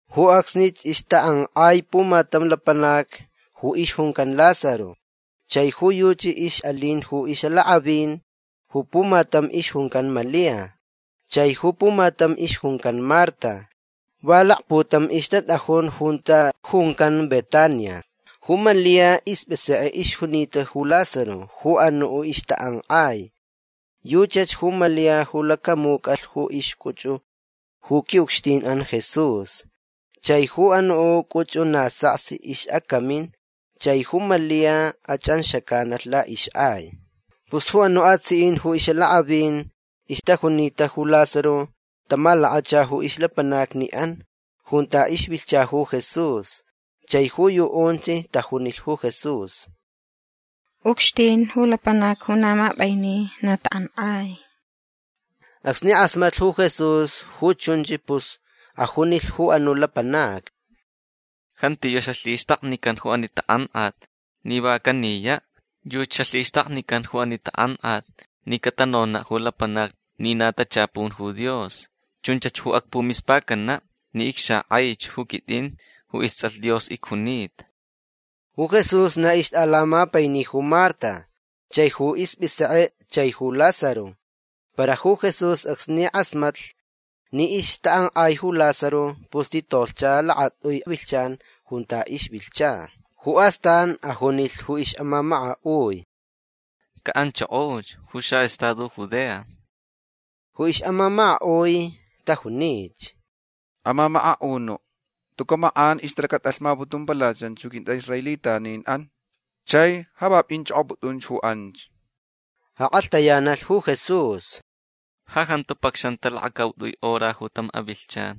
Ju acsnich ixtak'ank'ai pumatam lapanac ju ixjuncan Lázaro. Chai ju yuchi ix'alin ju ix'alak'avin. Ju pumatam ixjuncan Malia. Chai ju pumatam ixjuncan Marta. Va lakputam ixtat'ajun junta juncan Betania. Ju Malia isp'isek'e ixjunita ju Lázaro ju anu' ixtak'ank'ai. Yuchach ju Malia ju lacamuc'alh ju ixc'uch'u ju qui'ucxtin'an Jesús. Chai ju anu' c'uch'u na saksi ix'acamin. Chai ju Malia ach'anxac'analh la'ix'ai. Pus ju anu' atsi'in ju ix'alak'avin ixtajunita ju Lázaro tamalakacha ju ixlapanacni'an junta ixvilhcha ju Jesús. Chai ju yu'unch tajunilh ju Jesús: ―Ucxtin ju lapanac ju na map'aini na tak'ank'ai. Acsni k'asmatlh ju Jesús ju chunch pus ajunilh ju anu' lapanacni: ―Jantiyu' xalhixtaknican ju ani tak'ank'at ni va caniya'. Yuchi xalhixtaknican ju ani tak'ank'at ni catanona' ju lapanacni ni na tachapun ju Dios. Chunch ju acpumispacana' ni icxak'aich ju quit'in ju ists'alh Dios icjunita. Ju Jesús na ixt'alamapaini ju Marta chaich ju isp'isek'e chaich ju Lázaro. Para ju Jesús acsni k'asmatlh ni ixtak'ank'ai ju Lázaro pus titolhcha lakat'ui vilhchan junta ixvilhcha. Ju astan ajunilh ju ix'amamaka'ui: ―Ca'anchokoch ju xa'estado Judea. Ju ix'amamaka'ui tajunich: ―Amamaka'unu' tuca' mak'an ixtalacat'alhmaputumpalachan ju quint'a'israelitanin'an. Chai ja va p'inch'ok'op'ut'unch ju anch. Ak'alhtayanalh ju Jesús: ―Ja jantu pacxanta lakacaut'ui hora ju tam avilhchan.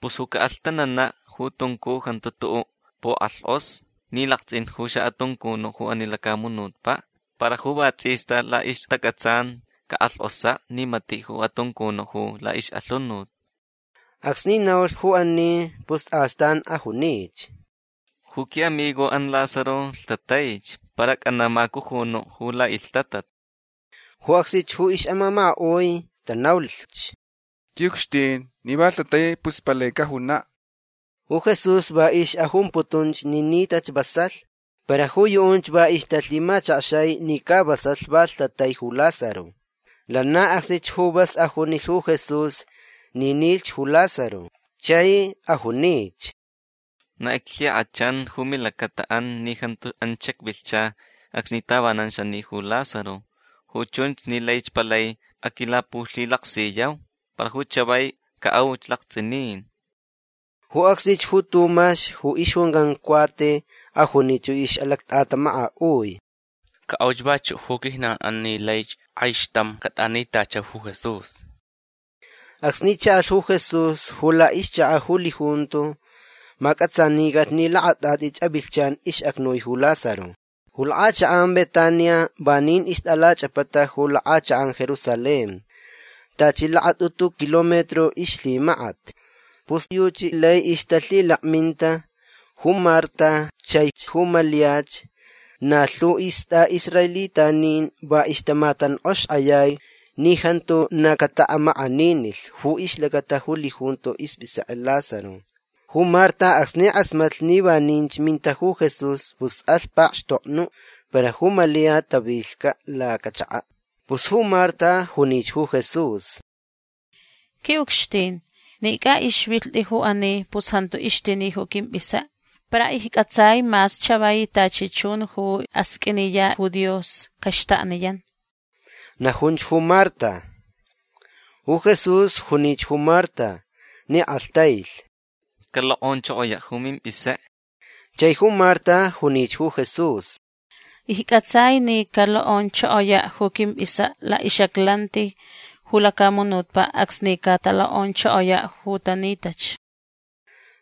Pus ju ca'alhtanana' ju tuncu jantu tu'u' puk'alhk'osa ni lakts'in ju xa'atuncunu' ju ani lacamunutpa'. Para ju va ts'ista la'ixtac'atsan cak'alhk'osa' ni mati' ju atuncunu' ju la'ix'alhunut. Acsni naulh ju ani pus astan ajunich: ―Ju qui'amigo'an Lázaro lhtataich. Para ac'ana' macujunu' ju la'ilhtatat. Ju acsnich ju ix'amamaka'ui tanaulhch: ―Qui'ucxtin ni va lhtatai pus palai cajuna'. Ju Jesús va ix'ajumputunch ni nitach vasalh. Para ju yu'unch va ixtalhimachakxai ni ca vasalh va lhtatai ju Lázaro. Lana acsnich ju vas ajunilh ju Jesús ni nilhch ju Lázaro. Chai ajunich: ―Na iclhik'achan ju milacata'an ni jantu anch xacvilhcha acsni tavanan xani ju Lázaro. Ju chunch ni laich palai aquilapulhilaksiyau. Para ju chavai ca'auch lakts'inin. Ju acsnich ju Tumax ju ixjuncan Cuate ajunich ju ix'alact'atamaka'ui: ―Ca'auch vachu' ju quijnan'an ni laich k'aixtam cat'anitachau ju Jesús. Acsni cha'alh ju Jesús ju la'ixchaka' ju lijunto mac'atsanicalh ni lakat'at'ich avilhchan ix'acnui ju Lázaro. Ju lak'achak'an Betania vanin ixt'alach'apata ju lak'achak'an Jerusalén. Tachi lakat'utu kilómetro ixlhimakat. Pus yuchi lai ixtalhilakminta ju Marta chaich ju Maliach na lhu ju ist'a'israelitanin. Va ixtamatank'oxaxk'ayai ni jantu na cata'amak'aninilh ju ixlacata ju lijunto isp'isek'e'an Lázaro. Ju Marta acsni k'asmatlh ni vaninch minta ju Jesús pus alh pakxtoknu'. Para ju Malia tavilhca' lacachaka'. Pus ju Marta junich ju Jesús: ―Qui'ucxtin ni c'a'ixvilht'i ju ani pus jantu ixtini ju quimp'isek'e. Para icc'atsai mas chavai tachi chun ju asq'uiniya' ju Dios caxtakniyan. ―Najunch ju Marta. Ju Jesús junich ju Marta ni k'alhtailh: ―Calok'onchokoya' ju mimp'isek'e. Chai ju Marta junich ju Jesús: ―Icc'atsai ni calok'onchokoya' ju quimp'isek'e la'ix'aclanti ju lacamunutpa' acsni catalok'onchokoya' ju tanitach.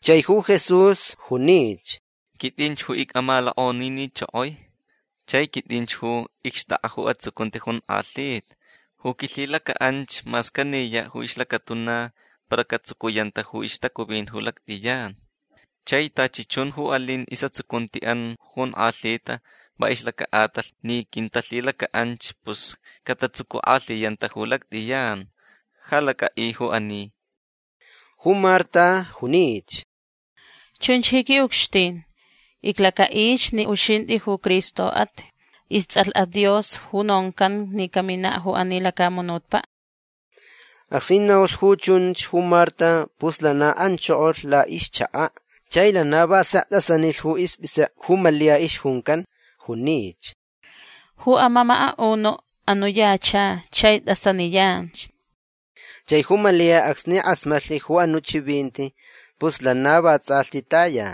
Chai ju Jesús junich: ―Quit'in ju ic'amalok'onininchokoi. Chai quit'inch ju icxt'ak'a ju atsucunti jonk'alhita. Ju quilhilaca'anch mas caniya' ju ixlacatuna para catsucuyanta ju ixtacuvin ju lact'iyan. Chai tachi chun ju alin is'atsucunti'an ju jonk'alhita va ixlaca'atalh ni quintalhilaca'anch pus catatsucuk'alhiyanta ju lact'iyan. Ja lac'a'i ju ani. Ju Marta junich: ―Chunch ji qui'ucxtin. Iclaca'ich ni uxint'i ju Cristo'at. Ists'alh'at Dios ju noncanch ni camina' ju ani lacamunutpa'. Acsni naulh ju chunch ju Marta pus lana anchokolh la'ixchaka'. Chai lana va sek t'asanilh ju isp'isek'e ju Malia ixjuncan. Junich: ―Ju amamaka'unu' anu' yacha chai t'asaniyanch. Chai ju Malia acsni k'asmatlh ju anu' chivinti pus lana vats'alhti taya.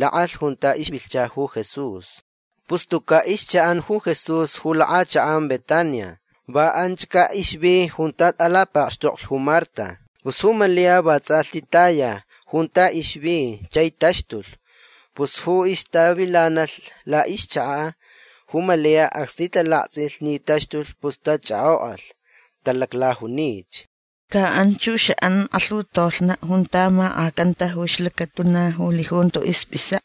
Lak'alh junta ixvilhcha ju Jesús. Pus tuca' ixcha'an ju Jesús ju lak'achak'an Betania. Va anchca' ixvi junta t'alapakxtoklh ju Marta. Pus ju Malia vats'alhti taya junta ixvi chai taxtulh. Pus ju ixtavilanalh la'ixchaka' ju Malia acsni talakts'ilh ni taxtulh pus tach'ak'ok'alh. Talaclajunich: ―Ca anch ju xa'an k'alhutolhna' junta mak'acanta ju ixlacatuna ju lijunto isp'isek'e.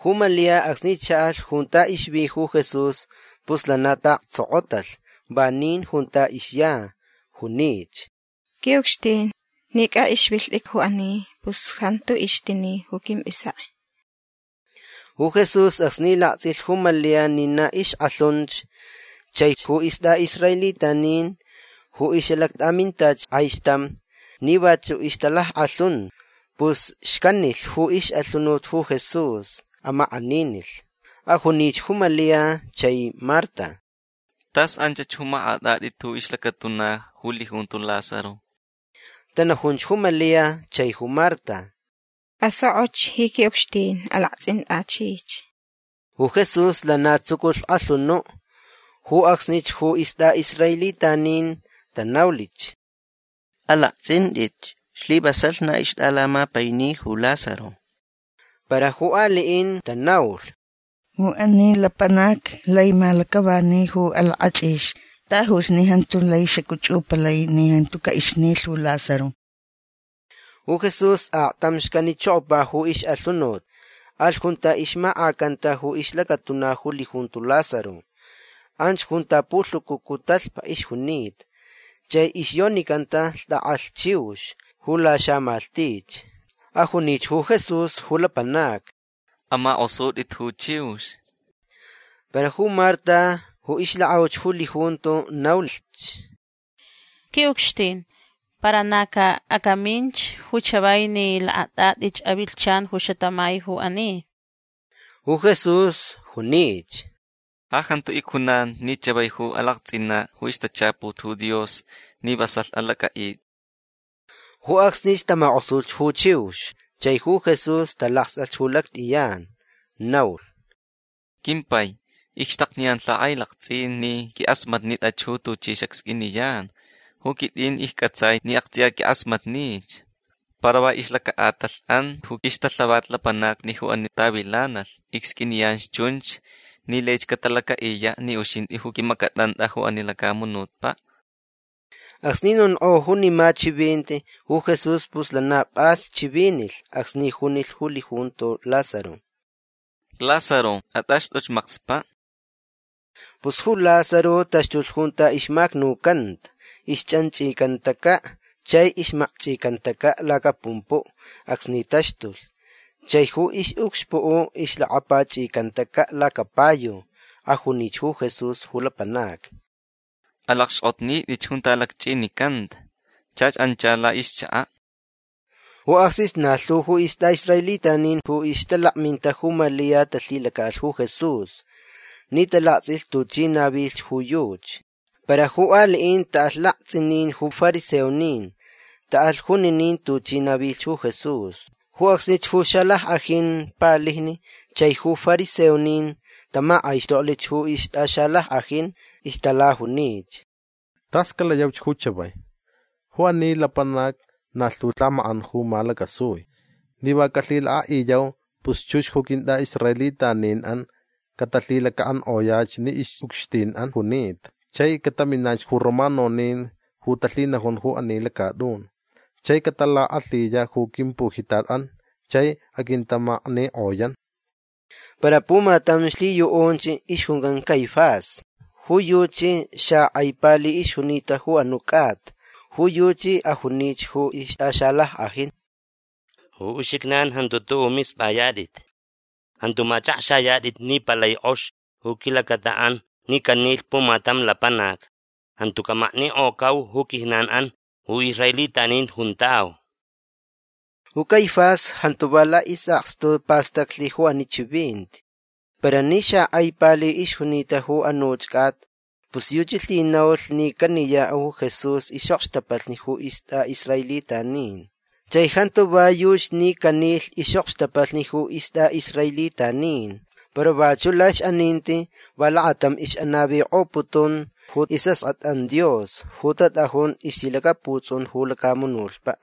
Ju Malia acsni cha'alh junta ixvi ju Jesús pus lana ta'aktsokotalh vanin junta ixya. Junich: ―Qui'ucxtin ni c'a'ixvilht'i ju ani pus jantu ixtini ju quimp'isek'e. Ju Jesús acsni lakts'ilh ju Malia ni na ixk'alhunch chaich ju ist'a'israelitanin ju ix'alact'amintach k'aixtam ni vachu' ixtalack'alhun pus xcanilhch ju ix'alhunut ju Jesús. Amak'aninilh. Ajunich ju Malia chai Marta: ―Tas anchach ju mak'at'at'it ju ixlacatuna ju lijunto Lázaro. Tanajunch ju Malia chai ju Marta: ―Asok'och ji qui'ucxtin. Alakts'int'achich. Ju Jesús lana tsuculh k'alhunu'. Ju acsnich ju ist'a'israelitanin tanaulhch: ―Alakts'int'itch. Slivasalh na ixt'alamapaini ju Lázaro. Para ju ali'in tanaulh: ―Ju ani lapanac lai malac'avani ju alak'ach'ix. Tajuch ni jantu lai xac'uch'upalai ni jantu c'a'ixnilh ju Lázaro. Ju Jesús aktam xcanichokopa ju ix'alhunut. Alh junta ixmak'acanta ju ixlacatuna ju lijunto Lázaro. Anch junta pulhucucu talhpa ixjunita. Chai ixyonicanta lht'ak'alh chiux ju laxamalhtich. Ajunich ju Jesús ju lapanacni: ―Amak'osut'it ju chiux. Para ju Marta ju ixlak'auch ju lijunto naulhch: ―Qui'ucxtin para na ca acaminch ju chavai ni lakat'at'ich avilhchan ju xatamai ju ani. Ju Jesús junich: ―Ja jantu icjunan ni chavai ju alakts'ina' ju ixtachaput ju Dios ni vasalh alac'a'it'i. Ju acsnich tamak'osulhch ju chiux. Chai ju Jesús talakst'alh ju lact'iyan. Naulh: ―Quimpai icxtakniyan lhak'ailakts'in ni quink'asmatnitach ju tuchi xacsq'uiniyan. Ju quit'in icc'atsai ni akts'iya quink'asmatnich. Para va ixlaca'atalh'an ju ixtalhavat lapanacni ju ani tavilanalh icsq'uiniyanch chunch ni laich catalaca'iya' ni uxint'i ju q'uimac'at'ant'a ju ani lacamunutpa'. Acsni nonk'o junima chivinti ju Jesús pus lana p'as chivinilh acsni junilh ju lijunto Lázaro: ―Lázaro at'axt'uch makspa'. Pus ju Lázaro taxtulh junta ixmacnucanta. Ixch'anch'icantaca' chai ixmakch'icantaca' lacapumpu' acsni taxtulh. Chai ju ix'ucxpu' ixlacapach'icantaca' lacapayu. Ajunich ju Jesús ju lapanacni: ―Alacxk'otnit'itch junta lacch'inicanta. Chach ancha la'ixchaka'. Ju acsnich na lhu ju ist'a'israelitanin ju ixtalakminta ju Malia talhilaca'alh ju Jesús ni talakts'ilh tuchi navilhch ju yuchi. Para ju ali'in ta'alh lakts'inin ju fariseonin. Ta'alh juninin tuchi navilhch ju Jesús. Ju acsnich ju xalack'ajin palijni chaich ju fariseonin tamak'aixtoklh ju ixt'axalack'ajin. Ixtalajunich: ―Tas calayauch ju chavai. Ju ani lapanac na lhu lhamak'an ju malacasui. Ni va calhilak'a'iyau pus chux ju quint'a'israelitanin'an catalhilaca'ank'oyach ni ix'ucxtin'an junita. Chai cataminach ju romanonin ju talhinajun ju ani lacat'un chai catalak'alhiya' ju quimpujitat'an chai aquintamaknik'oyan. Para pumatam lhiyu'unch ixjuncan Caifás. Ju yuchi xak'ai pali ixjunita ju anu' c'ata. Ju yuchi ajunich ju ixt'axalack'ajin: ―Ju uxijnan jantu tu'u' misp'ayat'it. Jantu mach'akxayat'it ni palai k'ox ju quilacata'an ni canilh pumatam lapanac. Jantu camaknik'ocau ju quijnan'an ju israelitanin juntau. Ju Caifás jantu va la'is'akstu pastaclh ju ani chivinti. Para ni xak'ai pali ixjunita ju anuch c'ata pus yuchi lhinaulh ni caniya' ju Jesús ix'okxtapalhni ju ist'a'israelitanin. Chai jantu va yuchi ni canilh ix'okxtapalhni ju ist'a'israelitanin. Para vachu' la'ix'aninti va lakatam ix'anavik'oputun ju is'ask'at'an Dios ju tat'ajun ixlhilacaputs'un ju lacamunutpa'.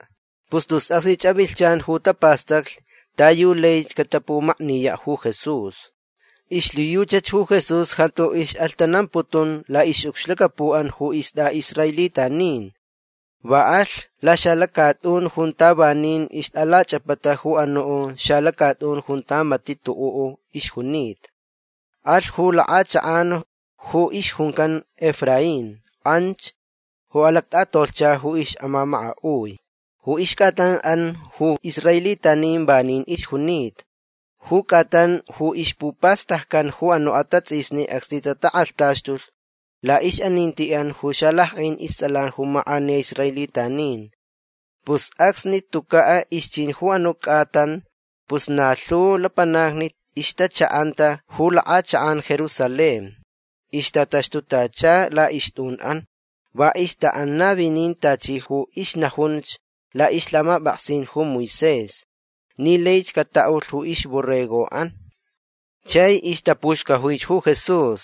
Pus tus acsnich avilhchan ju tapastaclh ta yu laich catapumakniya' ju Jesús. Ixlhiyuchach ju Jesús jantu ix'alhtanamputun la'ix'ucxlacapu'an ju ist'a'israelitanin. Va alh laxalacat'un junta vanin ixt'alach'apata ju anu' xalacat'un junta mati' tu'u' ixjunita. Alh ju lak'achak'an ju ixjuncan Efraín. Anch ju alact'atolhcha ju ix'amamaka'ui. Ju ixc'atan'an ju israelitanin vanin ixjunita. Ju c'atan ju ixpupastaccan ju anu' atats'isni acsni tatak'alhtaxtulh la'ix'aninti'an ju xalack'ajin ists'alan ju mak'aniya israelitanin. Pus acsni tuca' ixchin ju anu' c'atan pus na lhu lapanacni ixtacha'anta ju lak'achak'an Jerusalén. Ixtataxtutacha la'ixt'un'an. Va ixta'an navinin tachi ju ixnajunch la'ixlhamap'aksin ju Moisés ni laich cata'ulh ju ixborrego'an. Chai ixtapuxcajuich ju Jesús.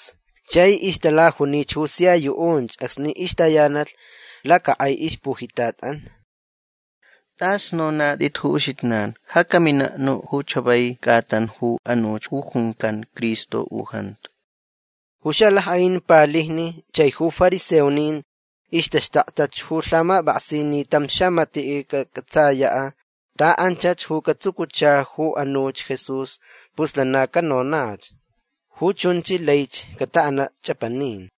Chai ixtalajunich ju sia yu'unch acsni ixtayanalh lacak'ai ixpujitat'an: ―T'as nonat'it ju uxijnan. Ja camina' nu' ju chavai c'atan ju anuch ju juncan Cristo u jantu. Ju xalack'ajin palijni chaich ju fariseonin ixtaxtaktach ju lhamap'aksin ni tam xamati' cac'atsaya' ta anchach ju catsucucha ju anuch Jesús pus lana canonach. Ju chunch laich cata'ana' ch'apanin.